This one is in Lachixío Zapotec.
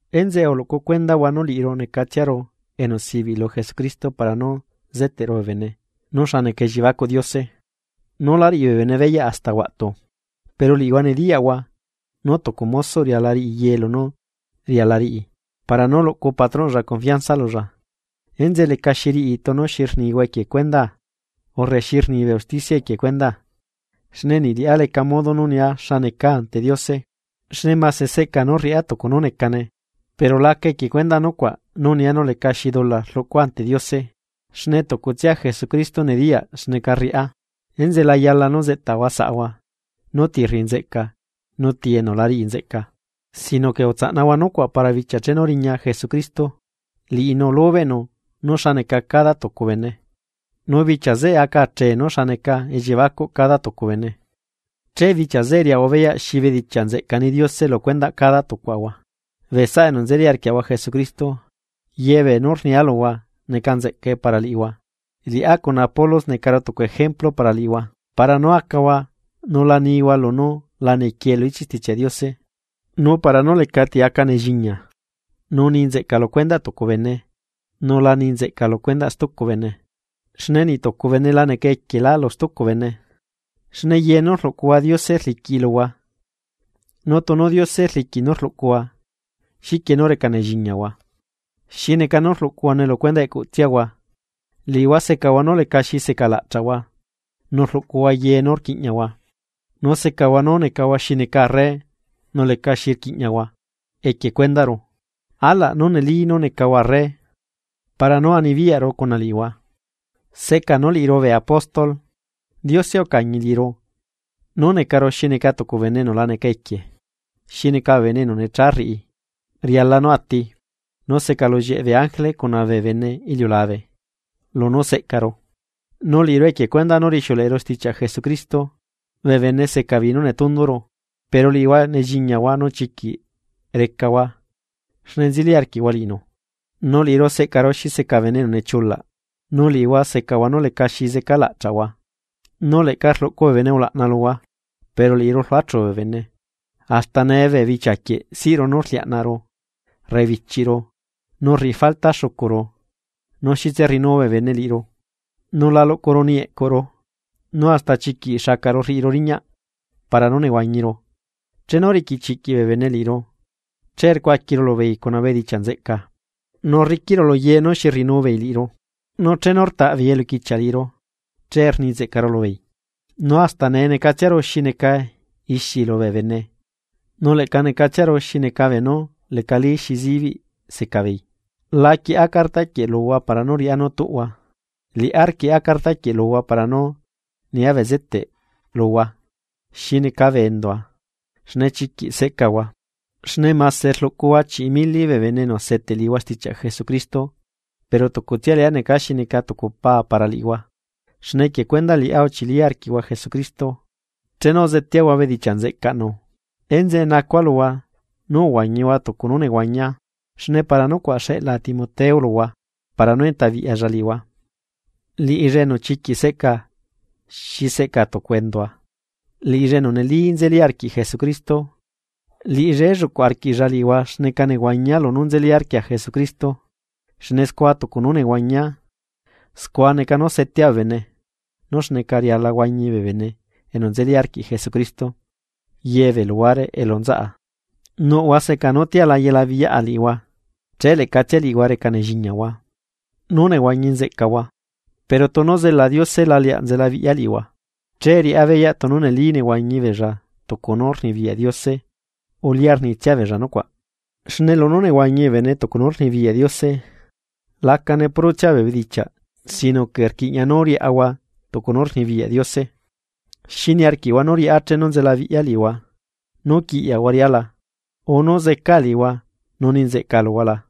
Enzeꞌe uluꞌcu cuendahua nú liꞌiru necatsiaru enu sibiꞌ lu Jesucristo para nú zeteꞌru bee bene nú xa neca elliebacuꞌ Diose, nú lá riꞌi bee bene beyaꞌ hasta huaꞌtu. Pero liꞌihua nediyaꞌhua nú tucu mosoꞌ riala riꞌi ye lunú riala riꞌi para nú luꞌcu patronꞌlla confianza lulla. Enzeꞌe lecaxi riꞌi tunu xi rnihua equie cuendaa urre xi rni bee usticia equie cuendaa, xne niꞌ liꞌá leca modo nú nia xa necaa ante Diose. Xne mase seꞌca nú rriꞌa tucu nú necane pero laca equie cuendaꞌ nucuaꞌ nú nia nú lecaxi dula rluꞌcua ante Diose, xne tucutsia Jesucristo nediyaꞌ xneca rriꞌa. Enzeꞌe la yala nú zeꞌtahua saꞌhua nú ti rriꞌi nzeꞌca nu ti enu la riꞌi nzeꞌca, sino que utsaꞌnahua nucuaꞌ para bichia chenu riña Jesucristo. Liꞌinu lubeꞌnu nú xa neca cada tucu bene, nu bichia zeꞌe aca chee nú xa neca elliebacuꞌ cada tucu bene, che bichia zeꞌe riaꞌahua beyaꞌ xi bedichiaꞌ nzeꞌca ni Diose lu cuendaꞌ cada tucuaꞌahua. Bee saꞌa enu nzeli arquiaꞌahua Jesucristo, yebee nú rnia luhua neca nzeꞌcae para liꞌihua. Liꞌá cuna Apolos necaru tucu ejemplu para liꞌihua, para nú acahua nu la nihua lunú la nequie lu ichiꞌ Stichiaꞌ Diose, nu para nú lecati aca nelliñia nu ni nzeꞌca lu cuendaꞌ tucu bene, nu la ni nzeꞌca lu cuendaꞌ stucu bene. Xne niꞌtucu bene la neca equielá lu stucu bene, xne ye nú rluꞌcuhua Diose rliquiꞌi luhua, nu tunu Diose rliquiꞌ nú rluꞌcuhua, ¿xiquie nú reca nelliñiahua? Xi neca nú rluꞌcuhuane lu cuendaꞌ eꞌcutsiahua. Liꞌihua secahua nú lecaxi seca laꞌchaꞌhua nu rluꞌcuhua ye nú rquiꞌñiahua, nu secahua nú necahua xi neca arre nu lecaxi rquiꞌñiahua equie cuendaꞌru ¡Alaꞌ nú neli nú necahua arre para nú anibiyaꞌru cuna liꞌihua! Seꞌca nú liꞌiru bee apóstol, Diose ucañi liꞌiru nú necaru xi neca tucu bene enu la neca equie, xi neca bee bene enu necha rriꞌi riala nú ati, nu secalullieꞌ bee ángele cuna bee bene iliulabe lunú seꞌcaru. Nu liꞌiru equie cuendaꞌ nú rixiuleꞌeru stichiaꞌ Jesucristo, bee bene seca beei nú netunduru, pero liꞌihua nelliñiahua nú chiquiꞌ recahua xne nzeli arquiꞌhua liꞌinu. Nu liꞌiru seꞌcaru xi seca bene enu nechiulaꞌ, nu liꞌihua secahua nú lecaxi zeca laꞌchaꞌhua, nu leꞌca rluꞌcu bee bene ulaꞌna luhua, pero liꞌiru rluachu bee bene. Hasta nee, bichia quieꞌ siꞌru nú rliaꞌnaꞌru, rrebichiꞌru, nu rriꞌi falta xucuru. Nu xitse rriꞌinu bee bene liꞌiru, nu la luꞌcuru niꞌi eꞌcuru, nu hasta chiquiꞌ xacaꞌru rriꞌiru riñaꞌ, para nú nehuañiru. Chenu riquichiꞌquiꞌ bee bene liꞌiru, che rcuaquiru lubeei cuna bedichiaꞌ nzeꞌca, nu rriquiꞌru lu ye nú xi rriꞌinu beei liꞌiru. Nu chenu rtaꞌbeei eluquichiaꞌ liꞌiru, che rni nzeꞌcaru lubeei. Nu hasta nee necatsiaru xi neca ixi lubee bene nu leꞌca necatsiaru xi neca beenú lecali xi zibiꞌ secabeei. La quieꞌa carta quieꞌ luhua para nú riꞌá nú tuꞌhua, liꞌá rquieꞌa carta quieꞌ luhua para nú nia bezeteꞌ luhua xi neca bee endua xne chiquiꞌ seꞌcahua. Xne mase rluꞌcuhua chiꞌi mili bee bene enu seteꞌ liꞌihua stichiaꞌ Jesucristo, pero tucutsia liꞌá neca xi neca tucu pa para liꞌihua xne equie cuendaꞌ liꞌá uchili arquiꞌhua Jesucristo chenu uzeteahua bedichiaꞌ nzeꞌcaꞌnu. Enzeꞌe nacua luhua, nú uhuañihua tucu nú nehuañia. Xne para nucuaꞌ xeꞌlaa Timoteo luhua para nú enta biꞌyalla liꞌihua, liꞌilla enu chiquiꞌ seꞌcaa xi seꞌca tucu endua, liꞌilla enu neli nzeli arquiꞌ Jesucristo. Liꞌilla elluꞌcuꞌ arquiꞌlla liꞌihua xneca nehuañia lunú nzeli arquia Jesucristo, xne scua tucu nú nehuañia, scua neca nú setea bee bene nú xneca riala huañi bee bene enu nzeli arquiꞌ Jesucristo ye bee luhuare elu nzaꞌa. Nuꞌhua seca nú tia la yelabiꞌyaꞌa liꞌihua, che leꞌcatsia liꞌihua reca nelliñiahua nú nehuañi nzeꞌcahua. Pero tunu zela Diose la leaꞌ nzelabiꞌya liꞌihua, che riꞌá beyaꞌ tunu neli nehuañi beella tucu nú rnibiyaꞌ Diose o lia rnitsia beella nucuaꞌ. Xne lunú nehuañi bee bene tucu nú rnibiyaꞌ Diose, lacane purotsia bee bedichiaꞌ sino que rquiꞌña nú riaꞌahua tucu nú rnibiyaꞌ Diose. ¿Xi niarquiꞌhua nú riꞌá chenu nzelabiꞌya liꞌihua, nú quiꞌyahua riꞌá la, o nú zecaa liꞌihua nu ni nzeꞌca luhua la?